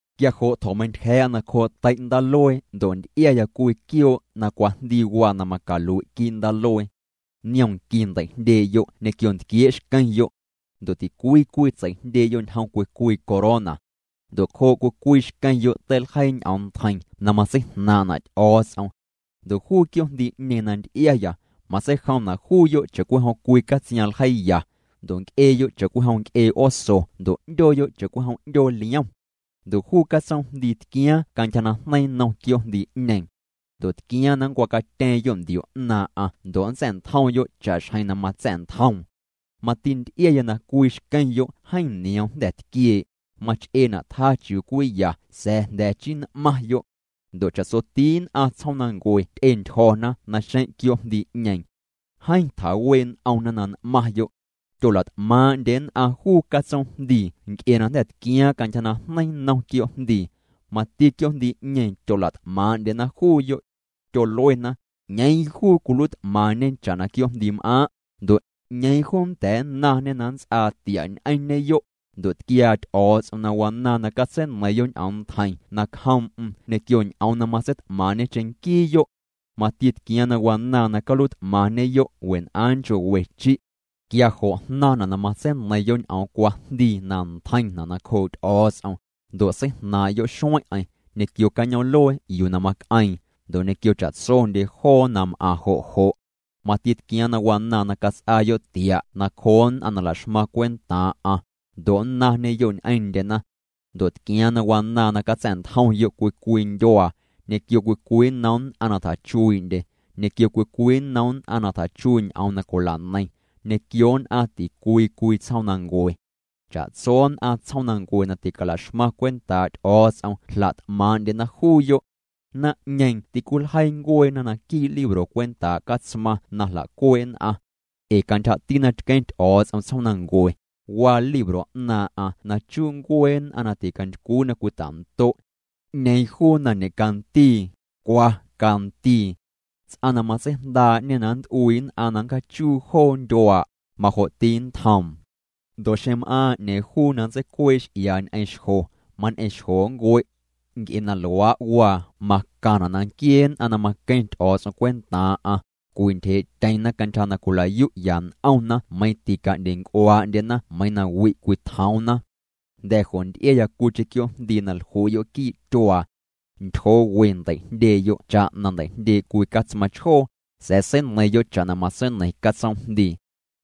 Quia jo' tjo̱meintyja̱a̱'a nacjoo' tei' ndaaluee ndo' nty'iaya cwii quioo' na cwajndii waa na macalui' quii' ndaaluee. Niom nqui ndei'jndyee'yo' ñequio ntquiee' xqueⁿyo'. Ndo' ticwii cwii tsei'jndyee'yo' ñjom cwii cwii corona. Ndo' cjoo' cwii cwii xqueⁿyo' teiljeii ñ'oom ntjeiⁿ na matseijnaaⁿ'na' Ty'o̱o̱ts'om. Ndo' juu quioo'jndii'ñeeⁿ na nty'iaya, matseijomna' juuyo' cha'cwijom cwii catsiaⁿ ljeiiya, ndo' nc'eeyo' cha'cwijom nc'ee oso ndo' 'ndyooyo' cha'cwijom 'ndyoo liom. Ndo' juu catsoomjndii tquiaaⁿ cantyja najneiⁿ nnom quioo'jndii'ñeeⁿ. Ndo' tquiaaⁿ na nncwacatyeeⁿyo' ndio 'naaⁿ'aⁿ ndo' nntsa̱'ntjomyo' cha'xjeⁿ na matsa̱'ntjoom. Mati nty'iaya na cwii xqueⁿyo' jeeⁿ nioom jnda̱ tquiee', mach'eena' tjaa chiuu cwii ya sa̱a̱ jnda̱ chii n'maⁿyo'. Ndo' cha'tsoti nn'aⁿ tsjoomnancue ty'entyjo̱na naxeⁿ' quioo'jndii'ñeeⁿ. Jeeⁿ tjawee' n'omna na n'maⁿyo'. Tyola't'maaⁿ'ndye nn'aⁿ juu catsoomjndii nc'e na jnda̱ tquiaaⁿ cantyja najneiⁿ nnom quioo'jndii. Mati quioo'jndii'ñeeⁿ tyola't'maaⁿ'ndyena juuyo'. Tyoluena: —¿'Ñeeⁿ juu cwiluiit'maⁿñe cha'na quioo'jndiim'aaⁿ'? Ndo' ¿'ñeeⁿ juu nnda̱a̱ nnaⁿñe na nnts'aa tia' ñ'eⁿñeyo'? Ndo' tquiaa Ty'o̱o̱ts'om na wanaaⁿ na catseineiⁿyo' ñ'oom ntjeiⁿ nacjoom'm ñequio ñ'oom na matseit'maaⁿ'ñe cheⁿnquiiyo'. Mati tquiaaⁿ na wanaaⁿ na caluiit'maⁿñeyo' wen'aaⁿ nchoo' we chi'. Quia jo' jnaⁿna' na matseineiⁿyo' ñ'oom cwajndii na ntjeiⁿna' nacjoo' Ty'o̱o̱ts'om, ndo' seijnaaⁿ'yo' xueⁿ'eⁿ, ñequio cañoom'luee yuu na mac'eeⁿ, ndo' ñequio cha'tsondye joo na m'aⁿ jo' jo'. Mati tquiaaⁿ na wanaaⁿ na cats'aayo' tia' nacjoo nn'aⁿ na la'xmaⁿ cwentaaⁿ'aⁿ, ndo' nnaⁿñeyo' ñ'eⁿndyena. Ndo' tquiaaⁿ na wanaaⁿ na catsa̱'ntjomyo' cwii cwii ndyuaa, ñequio cwii cwii nnom nn'aⁿ na tjachuii'ndye, ñequio cwii cwii nnom nn'aⁿ na tjachuii' ñ'oom na cwila'neiⁿ, ñequio nn'aⁿ ticwii cwii tsjoomnancue. Cha'tso nn'aⁿ tsjoomnancue na ticala'xmaⁿ cwentaa' Ty'o̱o̱ts'om jla't'maaⁿ'ndyena juuyo'. Naⁿ'ñeeⁿ tîcwiljeii ncueena naquii' libro cwentaa' Catsmaⁿ na jla'cuee' nn'aⁿ. Ee cantyjati na tqueⁿ Ty'o̱o̱ts'om tsjoomnancue, waa libro 'naaⁿ'aⁿ na chuu ncuee nn'aⁿ na ticantycwii na cwita'ndo'. 'Ñeeⁿ juu na ñe'candii, cwa candii. Ts'aⁿ na matseijndaa'ñê na nt'ueeⁿ nn'aⁿ na ncjaachom joona ndyuaaⁿ'aⁿ, majo'ti nntjoom. Ndo' xeⁿ m'aaⁿ 'ñeeⁿ juu na nntseicuee' x'iaa' ñ'eⁿ xjo, mañ'eⁿ xjo nncue'. Nc'e na luaa' waa macaⁿna' na nquiee nn'aⁿ na maqueⁿ Ty'o̱o̱ts'om cwentaaⁿ'aⁿ, cwintyjee'tyeⁿna cantyja na cwila'yu'ya n'omna meiⁿ tica'ndyenc'uaa'ndyena meiiⁿ wi' cwitjoomna. Jnda̱ jo' nty'iaya cwiicheⁿ quioo'jndii na jlui'yo' quii' tyuaa. Ntyjoo we ndei'jndyee'yo' cha'na ndei'jndyee' cwii catsmaⁿ chjoo, sa̱a̱ seineiⁿyo' cha'na matseineiⁿ catsoomjndii.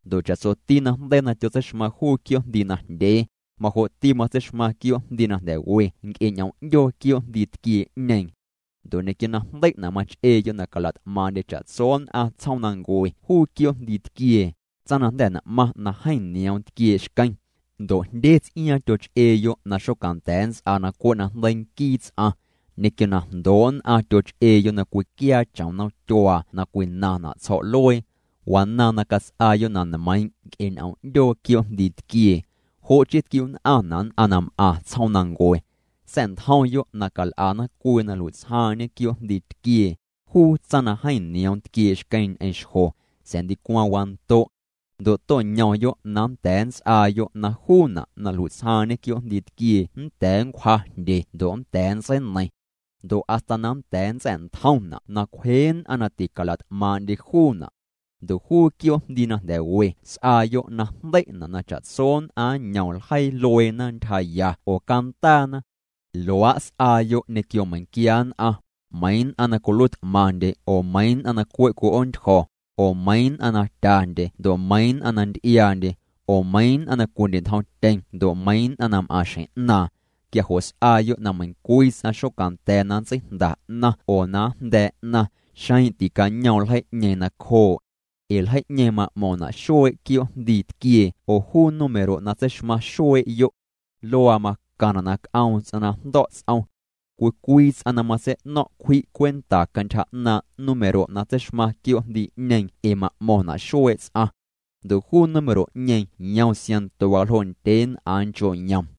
Ndo' cha'tsoti najndeii na tyotseixmaⁿ juu quioo'jndii najndyee, majo'ti matseixmaⁿ quioo'jndii na jnda̱ we nc'e ñ'oom 'ndyoo quioo'jndii tquiee'ñeeⁿ. Ndo' ñequio na jndei'na' mach'eeyo' na cala't'maaⁿ'ndye cha'tso nn'aⁿ tsjoomnancue juu quioo'jndii tquiee, tsaⁿ na jnda̱ n'maⁿ na jeeⁿ nioom tquiee' xqueⁿ. Ndo' jndye ts'iaaⁿ tyoch'eeyo' na xocanda̱a̱ nnts'aa na cwe' najndeii nquii ts'aⁿ. Ñequio na jndoo' nn'aⁿ tyoch'eeyo' na cwiquiaa chom nomtyuaa na cwinaⁿna' tsjo̱'luee. Wanaaⁿ na cats'aayo' na nmeiiⁿ' nc'e ñ'oom 'ndyoo quioo'jndii tquiee. Jo' chii tquiu'nn'aⁿna' nn'aⁿ na m'aⁿ tsjoomnancue. Sa̱'ntjomyo' na cal'ana cwii na nlui'tsjaaⁿ'ñe quioo'jndii tquiee, juu tsaⁿ na jeeⁿ nioom tquiee' xqueⁿ ñ'eⁿ xjo, sa̱a̱ ndicwaⁿ wando'. Ndo' to'ñomyo' na nnda̱a̱ nnts'aayo' na juuna' na jlui'tsjaaⁿ'ñe quioo'jndii tquiee nnda̱a̱ nncwja jndye ndo' nnda̱a̱ nntseineiⁿ. Ndo' hasta na nnda̱a̱ nntsa̱'ntjomna' na cwje nn'aⁿ na ticala't'maaⁿ'ndye juuna'. Ndo' juu quioo'jndii na nda̱ we s'aayo' na jndei'na' na cha'tso nn'aⁿ nñom ljeii lueena ntyjaya oo cantaana. Luaa' s'aayo' ñequio meiⁿnquia nn'aⁿ, meiiⁿ nn'aⁿ na cwiluiit'maⁿndye ndo' meiiⁿ nn'aⁿ na cwe' cwi'oontyjo̱, oo meiiⁿ nn'aⁿ na tyandye ndo' meiiⁿ nn'aⁿ na nty'iaandye, oo meiiⁿ nn'aⁿ na cwindye'ntjomtyeⁿ ndo' meiiⁿ nn'aⁿ na m'aⁿ xjeⁿ 'naaⁿ. Quia jo' s'aayo' na meiⁿcwii ts'aⁿ xocanda̱a̱ na nntseijnda 'naⁿ oo na njnda̱a̱ 'naⁿ xeⁿ ticañoom ljeii'ñeeⁿ nacjoo'. Ee ljeii'ñeeⁿ ma'mo̱ⁿna' xuee' quioo'jndii tquiee oo juu número na tseixmaⁿ xuee'yo'. Luaa macaⁿna' na c'oom ts'aⁿ na jndo̱' ts'om. Cwii cwii ts'aⁿ na matsei'no̱ⁿ' cwji' cwenta cantyja 'naaⁿ' número' na tseixmaⁿ quioo'jndii'ñeeⁿ ee ma'mo̱ⁿna' xuee' ts'aⁿ. Ndo' juu número'ñeeⁿ yom siaⁿnto waljoo' ndyeen'aaⁿ nchoo' yom.